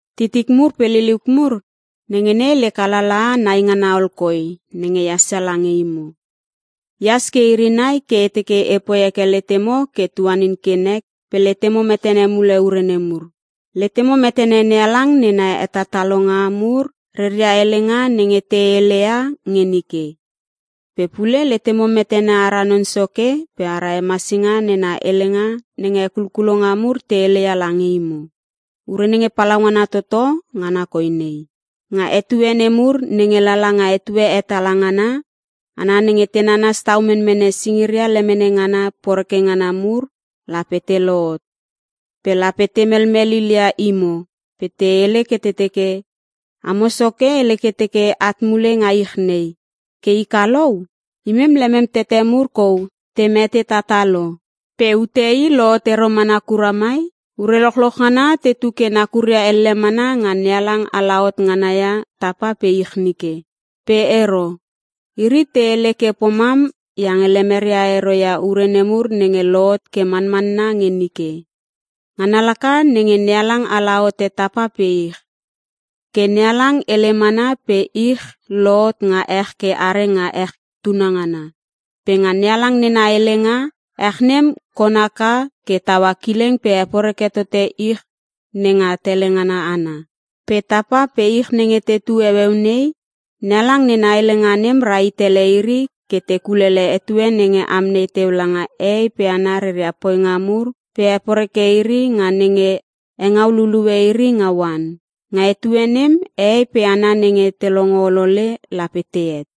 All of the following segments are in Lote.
Titik mur pe liliuk mur, nenge nei lek alalaha nai ngana ol koi nenge ehas ia lange imo. Ehas ke iri nai ke e teke epoi heke letemo ke tuanin ke nek pe letemo metene mule ure nemur. Letemo metene NeHalang nena hetatalonga mur reria helenga nenge te hele ia nge nike. Pe pule letemo metene ara Non Soke pe ara Hemasinga nena helenga nenge hekulkulonga mur te hele ia lange imo. Ure nenge palaungana toto ngana koi nei: Nga etue nemur nenge lala nga etue hetala ngana, hana nenge te nanas tau menmene singiria lemene ngana poreke ngana mur lape te lohot. Pe lape te melmel lilia imo pe te hele ke te teke, “Amo Soke hele ke teke at mule nga ich nei. Ke i kalou? Imem lemem tete mur kou te mete tatah lo, pe ute i lohot ero mana kura mai. Ure lochloch ngana tetu ke nakuria elle mana nga NeHalang alahot ngana ia tapa pe ich nike!” Pe ero. Iri te hele ke pomam iange lemeria ero ia ure nemur nenge lohot ke manmanna nge nike: Ngana laka nenge NeHalang ala hote tapa pe ich. Ke NeHalang hele mana pe ich lohot nga ech ke are nga ech tunangana. Pe nga NeHalang nena helenga, ech nem kon haka ke taua kileng pe heporeke tote ich nenga tele ngana ana. Pe tapa pe ich nenge tetu heueu nei, NeHalang nena helenga nem rahit ele iri ke te kulele etue nenge amnei teu langa hehei pe hana reria poinga mur pe heporeke iri nga nenge hengau lulue iri nga oan. Nga etue nem hehei pe hana nenge te longo olole lape tehet.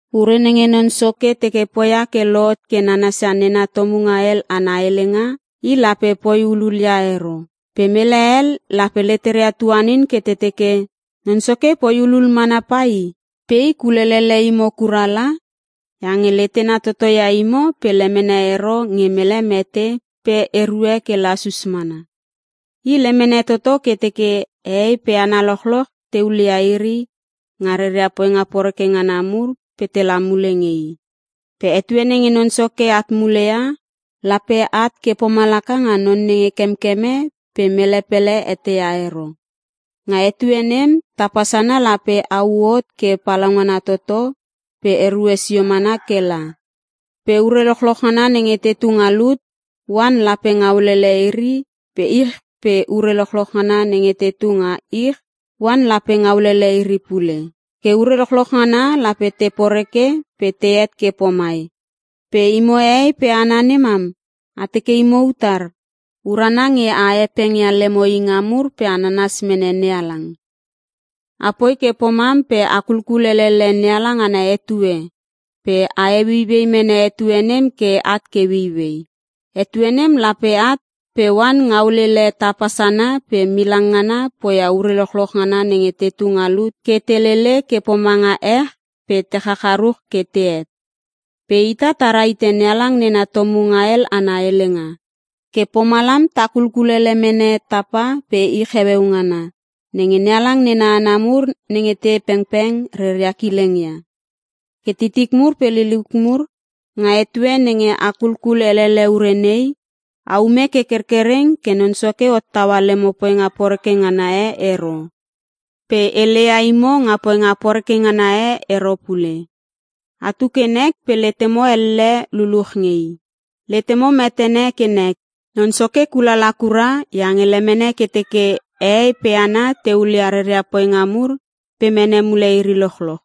Ure nenge Non Soke teke poia ke lohot ke nanasia nena tomunga hel ana helenga, i lape poi hulul ia ero. Pe mele hel lape leteria tuanin ke te teke Non Soke poi hulul mana pai. Pe i kulelele imo kura la, iange letena toto ia imo pe lemene ero nge mele mete pe erue ke lasus mana. I lemene toto ke teke hehei pe hana lochloch te hulia iri nga reria poinga poreke ngana mur pe tela mule nge i. Pe etue nenge Non Soke at mule ia, lape at ke pomalaka nga non nenge kemkeme pe mele pele eteia ero. Nga etue nem tapa sana lape hau hot ke palaungana toto pe erue sio mana ke la. Pe ure lochloch ngana nenge tetu nga lut, oan lape ngaulele iri pe ich pe ure lochloch ngana nenge tetu nga ich, oan lape ngaulele iri pule. Ke ure lochloch ngana lape te poreke pe tehet ke pomai pe imo hehei pe hana nemam, a teke imo utar? Urana nge a hepeng ia lemo inga mur pe a nanas mene NeHalang. Apoi ke pomam pe a kulkul elele NeHalang ana etue, pe a heueiuei mene etue nem ke at ke ueiuei. Etue nem lape at pe oan ngaulele tapa sana pe milang ngana poia ure lochloch ngana nenge tetu nga lut ke te lele ke pomanga ech pe te chacharuch ke tehet. Pe ita ta rahite NeHalang nena tomunga hel ana helenga. Ke pomalam ta kulkulele mene tapa pe ich heueu ngana, nenge NeHalang nena hana nemur nenge te pengpeng reria kileng ia. Ke titik mur pe liliuk mur, nga etue nenge a kulkul elele ure nei, aume ke kerkereng ke Non Soke hottaua lemo poinga poreke ngana e ero, pe heleia imo nga poinga poreke ngana e ero pule. Atu ke nek pe letemo elle luluch nge I. Letemo metene ke nek, Non Soke kulala kura iange lemene ke teke hehei pe hana te hulia reria poinga mur pe mene mule iri lochloch.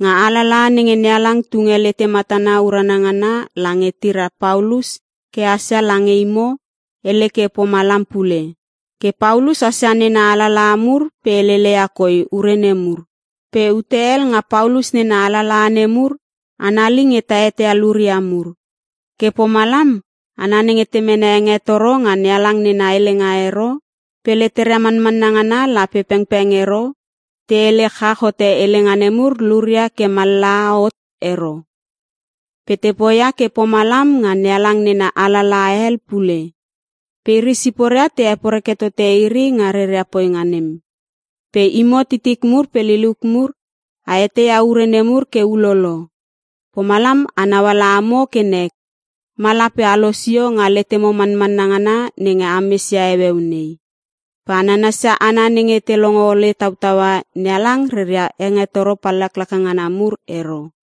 Nga alalaha nenge NeHalang tunge lete matana urana ngana lange tira Paulus ke hasia lange imo, hele ke pomalam pule. Ke Paulus hasia nena alalaha mur pe heleleia koi ure nemur. Pe ute hel nga Paulus nena alalaha nemur, anali nge ta eteia luria mur. Ke pomalam hana nenge te mene hengetoro nga NeHalang nena helenga ero, pe leteria manmanna ngana la pengpeng ero, te hele chach hote helenga nemur luria ke mallaha hot ero. Pe te poia ke pomalam nga NeHalang nena alalaha hel pule. Pe iri siporia te heporeke tote iri nga reria poinga nem. Pe imo titik mur pe liliuk mur, a eteia ure nemur ke ulolo. Pomalam anau ala amo ke nek, ma lape a losio nga letemo manmanna ngana nenge ames ia heueu nei. Pe a nanasia hana nenge te longo ole tautaua NeHalang reria hengetoro pallaklaka ngana mur ero.